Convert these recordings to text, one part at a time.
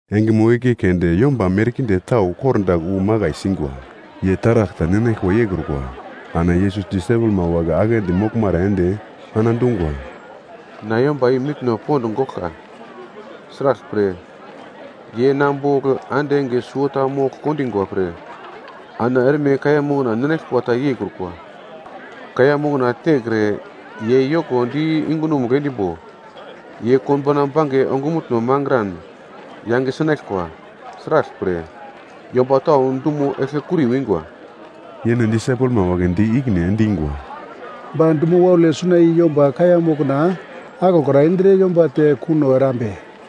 Engemo igle keunde yomba merkinde tau kordagl wu makai singwa. Ye taragl ta ninaglkwa yeikrukwa. Ana Yesus disaipelma wagle aglendi moglmara ende ana dungwa, “Na yomba i mitno pond goglka. Sraglpre ye na bogl ande enge suwota mogl kondingwa pre ana erme kaiya mokna ninaglkwa ta yeikrukwa. Kaiya mokna tekre ye yoko di yungunomugl endimbo, ye konbauna bange ongumutno mangran yange sinaglkwa. Sraglpre, yomba tau dumo eglkekuri wingwa.” Yene disaipelma wagle di ikine endingwa, “Ba dumo waule suna i yomba kaiya mokna aglokra indre yomba te kuno erambe?”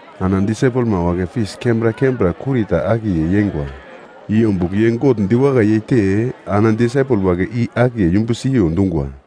Ana disaipelma wagle fis kembra kembra kurita akiye yeingwa. I ombugl ye God diwakai yeite ana disaipel wagle i akiye yumbu siyo dungwa.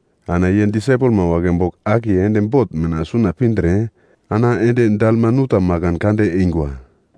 Ana ye disaipelma wagle bogl akiye ende bot mina suna pindre ana ende Dalmanuta makan kande eingwa.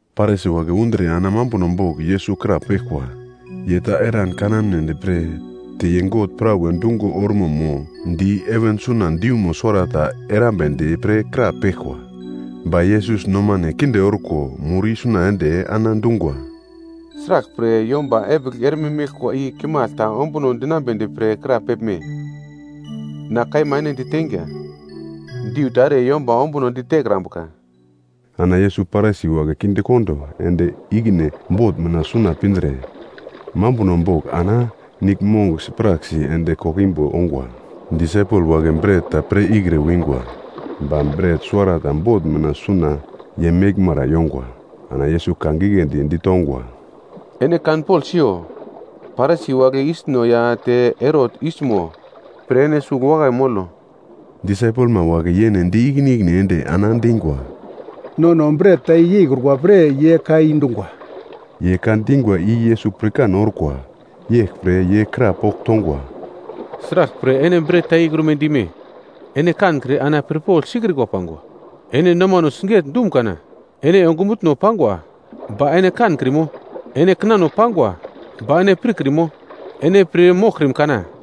Parisi wagle undre ana mambuno bogl Yesus krapeglkwa. Ye ta eran kanamnedi pre te ye God prawe dungo ormo mo di heven suna diumo suwarata erambedi pre krapeglkwa. Ba Yesus nomane kinde orko mur isuna ende ana dungwa, “Sraglpre yomba epigl erme meglkwa i kimagl ta ombuno dinambedi pre krapeglme? Na kaima ene diteinga, diu ta ere yomba ombunodi tekrambuka.” Ana Yesus Parisi wagle kindekondo ende ikine bot mina suna pindre, mambuno bogl ana niglmong sipraksi ende koglo imbo ongwa. Disaipelma wagle bret ta pir ikre wingwa, ba bret suwarata bot mina suna ye meglmara yongwa. Ana Yesus ka giglendi ditongwa, “Ene kanpogl siyo, Parisi wagle yisno ya te Herot yismo pre ene sugl wakai molo.” Disaipelma wagle yene di ikine ikine ende ana dingwa, “Nono bret ta yeikrukwa pre, ye ka i dungwa.” Ye ka dingwa i Yesus pirkan orkwa, yeglpre ye krapogl tongwa, “Sraglpre ene bret ta yeikrume dime? Ene kankre ana pirpogl sikrikwa pangwa? Ene nomano siget-dum kana? Ene ongumutno pangwa, ba ene kankrimo? Ene kinano pangwa, ba ene pirkrimo? Ene pir moglkrim kana?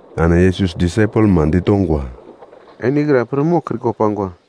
Ana Yesus disaipelma ditongwa, “Ene ikra pir moglkrikwa pangwa?”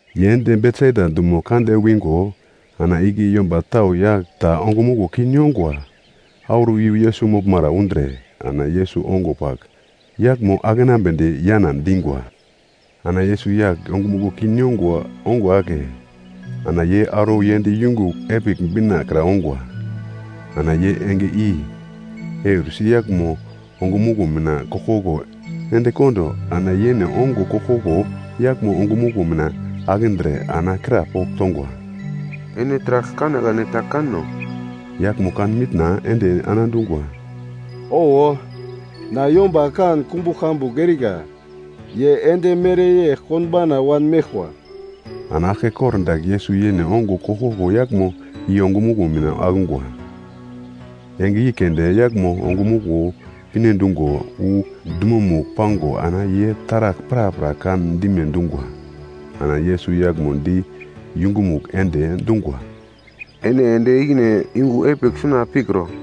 Ye ende Betsaida dumo kande wingo ana igle yomba tau yagl ta ongumuglo kin yongwa auro iyu Yesus moglmara undre, ana Yesus ongo pagl yaglmo akenambedi yana dingwa. Ana Yesus yagl ongumuglo kin yongwa ongo ake, ana ye auro yend yungu epigl bina kra ongwa. Ana ye enge i eursi yaglmo ongumuglo mina koglkoglo endekondo ana yene ongo koglkoglo yaglmo ongumuglo mina akindre, ana krapogl tongwa, “Ene taragl kanekane ta kano?” Yaglmo kan mitna ende ana dungwa, “Owo, na yomba kan kumbugl kambugl erika, ye endi mereyegl konbauna wanmeglkwa.” Ana aglke kordagl Yesus yene ongo koglkoglo yaglmo i ongumuglo mina akungwa. Enge i keunde yaglmo ongumuglo pinedungo wu dumomugl pango ana ye taragl prapra kan dime dungwa. Ana Yesus yaglmo di yungumugl ende dungwa, “Ene ende ikine yungu epigl suna pikro.”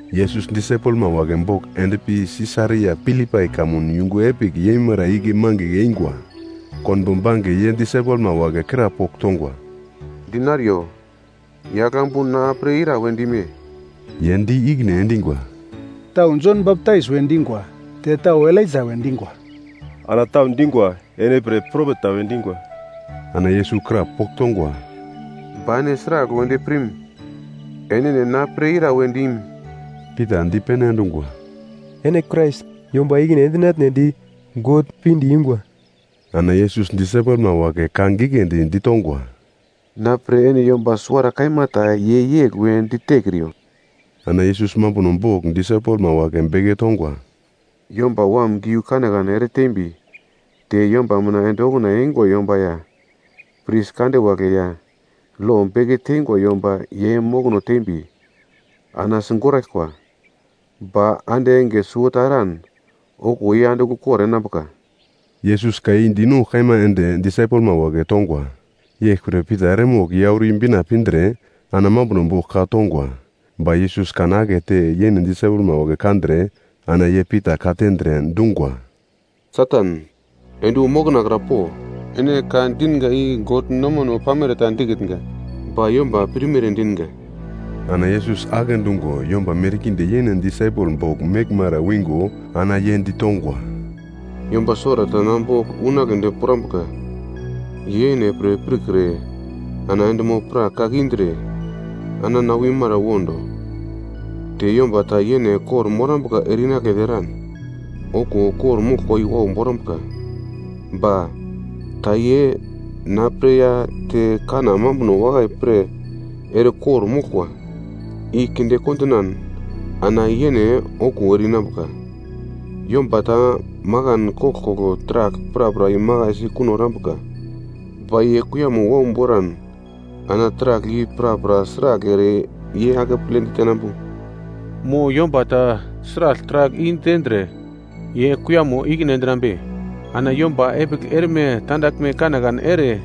Yesus disaipelma wagle bogl endpi Sisaria Filipai kamun yungu epigl yeimara igle mangigl eingwa. Konbo bange ye disaipelma wagle krapogl tongwa, “Dinariyo, yagl ambu na pre ira we dime?” Ye di ikine endingwa, “Tau Jon Baptais we dingwa, te tau Elaija we dingwa, ana tau dingwa, ene pre propet ta we dingwa.” Ana Yesus krapogl tongwa, “Ba ene sragl wedi pirm? Enene na pre ira we dim?” Pita dipene endungwa, “Ene Krais, yomba ikine endinatnedi God pinde yungwa.” Ana Yesus disaipelma wagle ka giglendi ditongwa, “Na pre ene yomba suwara kaima ta ye yegl we ditekriyo.” Ana Yesus mambuno bogl disaipelma wagle beke tongwa, “Yomba Wam giu kanekane ere tembi, te yomba mina ende okuna eingwa yomba ya pris kande wagle ya, lo beke teingwa yomba ye mokono tembi, ana sigoraglkwa. Ba ande enge suwota eran okuwo ye andigl ukor enambuka.” Yesus ka i dinongugl kaima ende disaipelma wagle tongwa. Yeglpre Pita eremogl ye auro i-bina pindre ana mambuno bogl ka tongwa. Ba Yesus kan akete yene disaipelma wagle kandre ana ye Pita ka tendre, dungwa, “Satan, ende wu na mokona kra po, ene ka dinga i God nomano pamere ta dikitnga, ba yomba pirmere dinga!” Ana Yesus agle dungo yomba merkinde yene disaipel bogl meglmara wingo ana ye ditongwa, “Yomba suwarata na bogl unagledi pirambuka, ye yene pre pirkre ana endimo-prak kake indre, ana na wimara wondo. Te yomba ta yene kor-morambuka ere-inagledi eran, okuwo kor-moglkwa i wau borambuka. Ba, ta ye na pre ya te kanna mambuno wakai pre ere kor-moglkwa i kinde kondinan ana yene okuwo ere-inambuka. Yomba ta makan koglkoglo taragl prapra imakaisi kuno erambuka, ba ye kuiyamo wau boran ana taragl i prapra sragl ere ye akeple ditenambu? Mo yomba ta sragl taragl i-tendre ye kuiyamo ikine endinambe? Ana yomba epigl erme tandaglme kanekane ere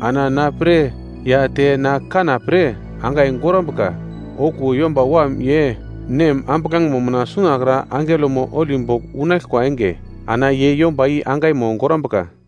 ana na pre ya te na kanna pre angai gorambuka, okuwo Yomba Wam ye Nem ambuglangemo mina sunakra angelomo holi bogl unaglkwa enge, ana ye yomba i angaimo gorambuka.”